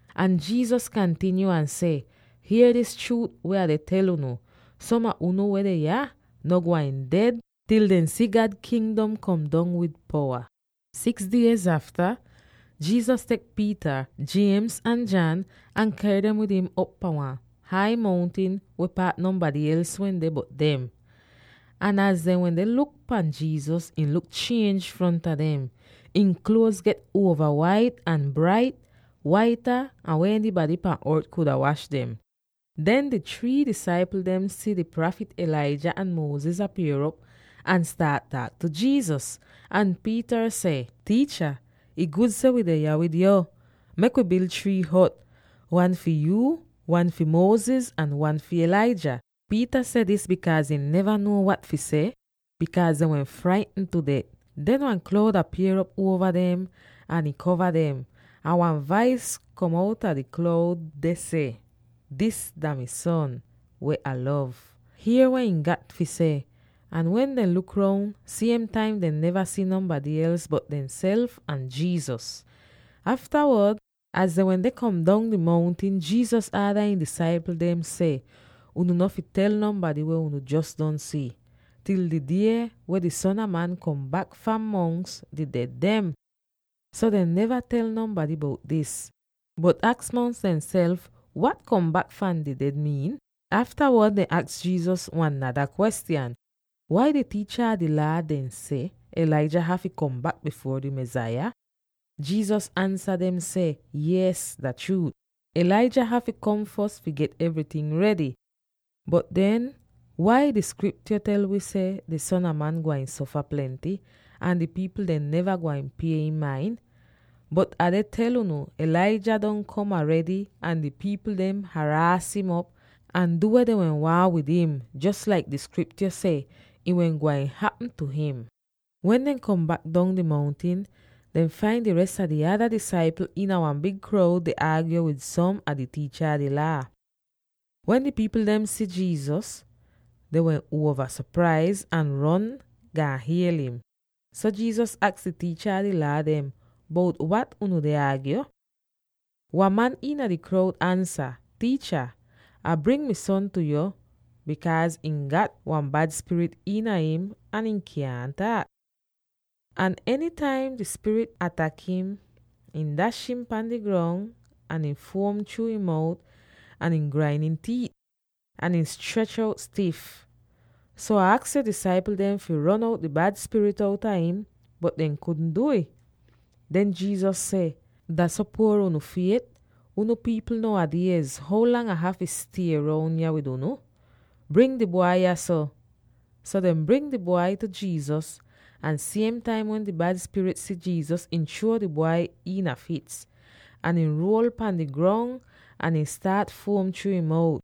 Ahn Jesus kantinyo ahn seh, “Hier dis chruut weh Ah deh tel unu: Som a unu weh deh yah no gwain ded til dehn si God Kingdom kom dong wid powa.” Six diez afta, Jesus tek Peter, James ahn John, ahn ker dem wid im op pahn wan hai mountin weh paat nonbady els wehn deh bot dem. Ahn az dehn wende luk pahn Jesus, ihn luk chienj fronta dem: ihn kluoz get uova wait ahn brait, waita an weh enybady pan ort kuda wash dem. Den di three disaipl dem si di prafit Elijah ahn Moses apier'op ahn staat taak tu Jesus. Ahn Peter seh, “Tiicha, ih gud seh wi deh yah wid yo! Mek wi bil three hot —wan fi yuu, wan fi Moses, ahn wan fi Elijah.” Peter seh dis bikaaz ihn neva nuo wat fi seh, bikaaz dehn wehn fraitn tu det. Den wan kloud apier'op uova dem ahn ih kova dem, ahn wan vais kom outa di kloud ahn seh, “Dis dah mi Son, weh Ah lov. Hier weh ihn gat fi seh.” Ahn wen dehn luk roun, siem taim dehn neva si nonbady els bot dehnself ahn Jesus. Aftawod, az dehn wende kom dong di mountin, Jesus aada ihn disaipl dem seh, “Unu no fi tel nonbady weh unu jos don si, til di die wen di Son a Man kom bak fahn mongs di ded dem.” So dehn neva tel nonbady bout dis, bot aks mongs dehnself wat “kom bak fahn di ded” miin. Aftawod dehn aks Jesus wan nada kwestyan, “Wai di tiicha a di Laa dehn seh Elijah hafy kom bak bifuor di Mesaya?” Jesus ansa dem seh, “Yees, dah chruut, Elijah hafy kom fos fi get evryting redy; bot den, wai di Skriptyo tel wi seh di Son a Man gwain sofa plenty, ahn di pipl dem neva gwain pie im main? Bot Ah deh tel unu: Elijah don kom aredy, ahn di pipl dem haraas im op ahn du weh dehn wehn waahn wid im, jos laik di Skriptyo seh ih wehn gwain hapm tu him.” Wen dehn kom bak dong di mountin, dehn fain di res a di ada disaipl iina wan big kroud deh aagyo wid som a di tiicha a di Laa. Wen di pipl dem si Jesus, dehn wehn uova sopraiz ahn ron gaan hiel im. So Jesus aks di tiicha a di Laa dem, “Bout wat unu deh aagyo?” Wan man iina di kroud ansa, “Tiicha, Ah bring mi son tu yu, bikaaz ihn gat wan bad spirit iina im ahn ihn kyaahn taak. Ahn enytaim di spirit atak im, ih dash im pan di grong, ahn ihn fuom chruu ihn mout ahn ihn grain ihn tiit, ahn ihn strech out stif. So Ah aks yo disaipl dem fi ron out di bad spirit outa im, bot dehn kudn du'ih.” Den Jesus seh, “Dah so puor unu fiet, unu pipl now a diez! How lang Ah hafy stie roun yah wid unu? Bring di bwai yahso!” So dehn bring di bwai tu Jesus, ahn siem taim wen di bad spirit si Jesus, ih chruo di bwai iina fits, ahn ihn ruol pan di grong ahn ihn staat fuom chruu ihn mout.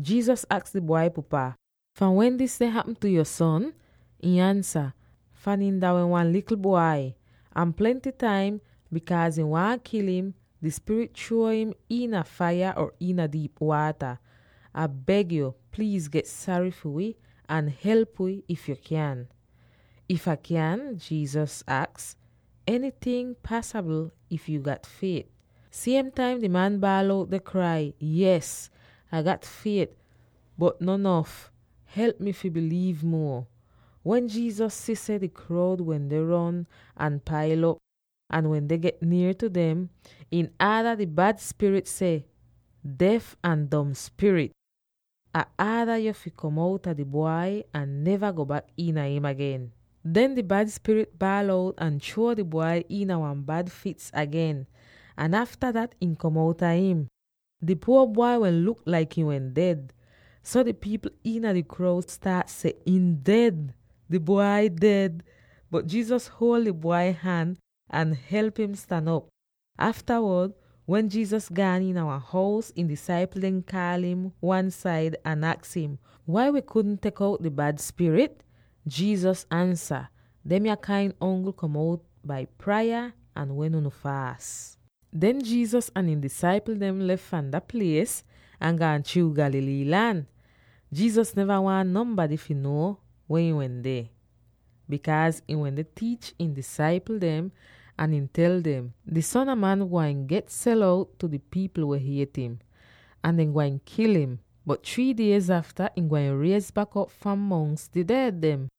Jesus aks di bwai pupa, “Fahn wen dis deh hapm tu yo son?” Ihn ansa, “Fahn ihn dah wehn wan likl bwai. Ahn plenty taim, bikaaz ih waahn kil im, di spirit chruo im iina faiya or iina diip waata. Ah beg yo, pliiz get sary fi wi ahn help wi, if yu kyan.” “If Ah kyan?” Jesus aks, “Enyting pasabl, if yu gat fiet.” Siem taim di man baal out deh krai, “Yees, Ah gat fiet, bot no nof. Help mi fi biliiv muo!” Wen Jesus si seh di kroud wende ron ahn pail op, ahn wende get nier tu dem, ihn aada di bad spirit seh: “Def ahn Dom Spirit, Ah aada yu fi kom outa di bwai, ahn neva go bak iina im agen.” Den di bad spirit baal out ahn chruo di bwai iina wan bad fits agen, ahn afta dat ih kom outa him. Di puor bwai wehn luk laik ihn wehn ded, so di pipl iina di kroud staat seh, “Ihn ded; di bwai ded.” Bot Jesus huol di bwai han ahn help im stan op! Aftawod, wen Jesus gaan iina wan hous, ihn disaipl dem kaal im wan-said ahn aks im, “Wai wi kudn tek out di bad spirit?” Jesus ansa, “Demya kain ongl kom out bai praya [ahn wen unu faas].” Den Jesus ahn ihn disaipl dem lef fahn dat plies ahn gaan chruu Galilee lan. Jesus neva waahn nonbady fi nuo weh ihn wehn deh, bikaaz ihn wende tiich ihn disaipl dem, ahn ihn tel dem, “Di Son a Man gwain get sel out tu di pipl weh hiet im, ahn dehn gwain kil im. Bot three diez afta, ihn gwain riez bak op fahn mongs di ded dem.”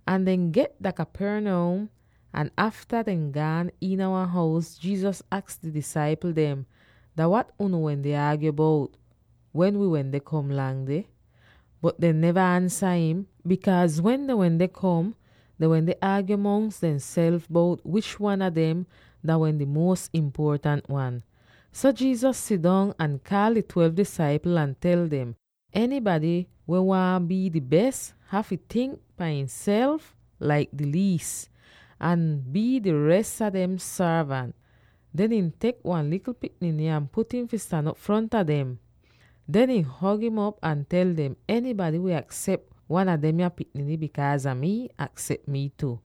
Ahn dehn get dah Capernaum, ahn afta dehn gaan iina wan hous, Jesus aks di disaipl dem, “Dah wat unu wende aagyo bout, wen wi wende kom lang deh?” Bot dehn neva ansa im, bikaaz wen dehn wende kom, dehn wende aagyo mongs demself bout wish wan a dem dah wehn di muos impuotant wan. So Jesus sidong ahn kaal di twelve disaipl ahn tel dem, “Enybady weh waahn bii di bes, hafy tink pan ihnself laik di liis, ahn bii di res a dem sorvant.” Den ihn tek wan likl pikniny ahn put im fi stan op fronta dem. Den ihn hog'im op ahn tel dem, “Enybady weh aksep wan a demya pikniny bikaaz a mii, aksep mii tu.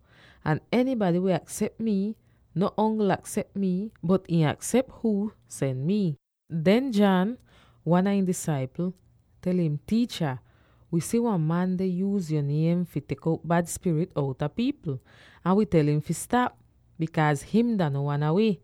Ahn enybady weh aksep mii no ongl aksep mii, bot ihn aksep huu sen mii.” Den John, wan a ihn disaipl, tel im, “Tiicha, wi si wan man deh yuuz yo niem fi tek out bad spirit outa pipl, ahn wi tel im fi stap, bikaaz him dah no wan a wi.”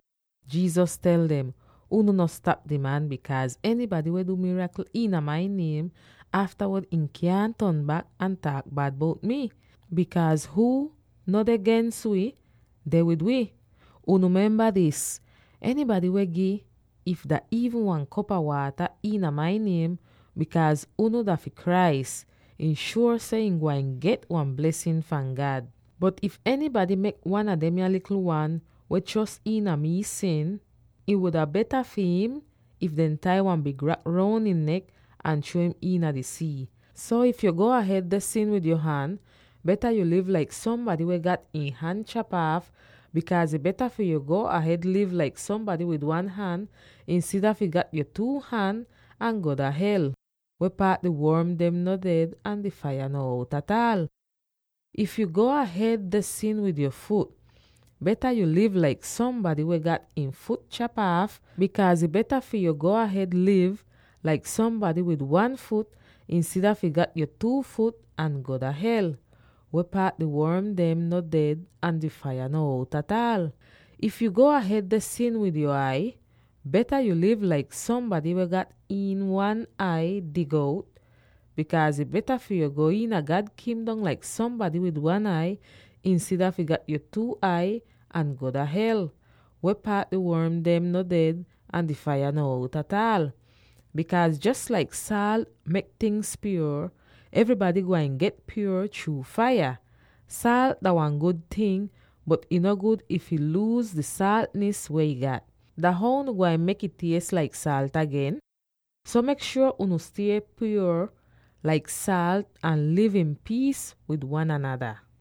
Jesus tel dem, “Unu no stap di man, bikaaz enybady weh du mirakl iina mai niem, aftawod ihn kyaahn ton bak ahn taak bad bout mi. Bikaaz huu no deh gens wi, deh wid wi. Unu memba dis: Enybady weh gi, if dah iivn wan kop a waata iina mai niem, bikaaz unu dah fi Christ, ih shuor seh ihn gwain get wan blesin fahn God. “Bot, if enybady kaaz wan a demya likl wan weh chros iina mi fi sin, ih wuda beta fi im if dehn tai wan big rak roun ihn nek ahn chruo im iina di sii. So, if yu go ahed deh sin wid yo han, beta yu liv laik sombady weh gat ihn han chap aaf, bikaaz ih beta fi yu go ahed liv laik sombady wid one han, insida fi gat yo two han ahn go dah hel. [Weh paat di worm dem no ded ahn di faiya no out ataal!] If yu go ahed deh sin wid yo fut, beta yu liv laik sombady weh gat ihn fut chap aaf, bikaaz ih beta fi yu go ahed liv laik sombady wid one fut, insida fi gat yo two fut ahn go dah hel. [Weh paat di worm dem no ded ahn di faiya no out ataal!] If yu go ahed deh sin wid yo ai, beta yu liv laik sombady weh gat ihn ai dig out, bikaaz ih beta fi yu go iina God Kingdom laik sombady wid one ai, insida fi gat yo two ai ahn go dah hel. Weh paat di worm dem no ded ahn di faiya no out ataal! “Bikaaz, jos laik saalt mek tingz pyuor, evrybady gwain get pyuor chruu faiya. “Saalt dah wan gud ting, bot ih no gud if ih luuz di saaltnis weh ih gat. Dah how unu gwain mek'ih ties laik saalt agen? So mek shuor unu stie pyuor laik saalt ahn liv iin piis wid wan anada.”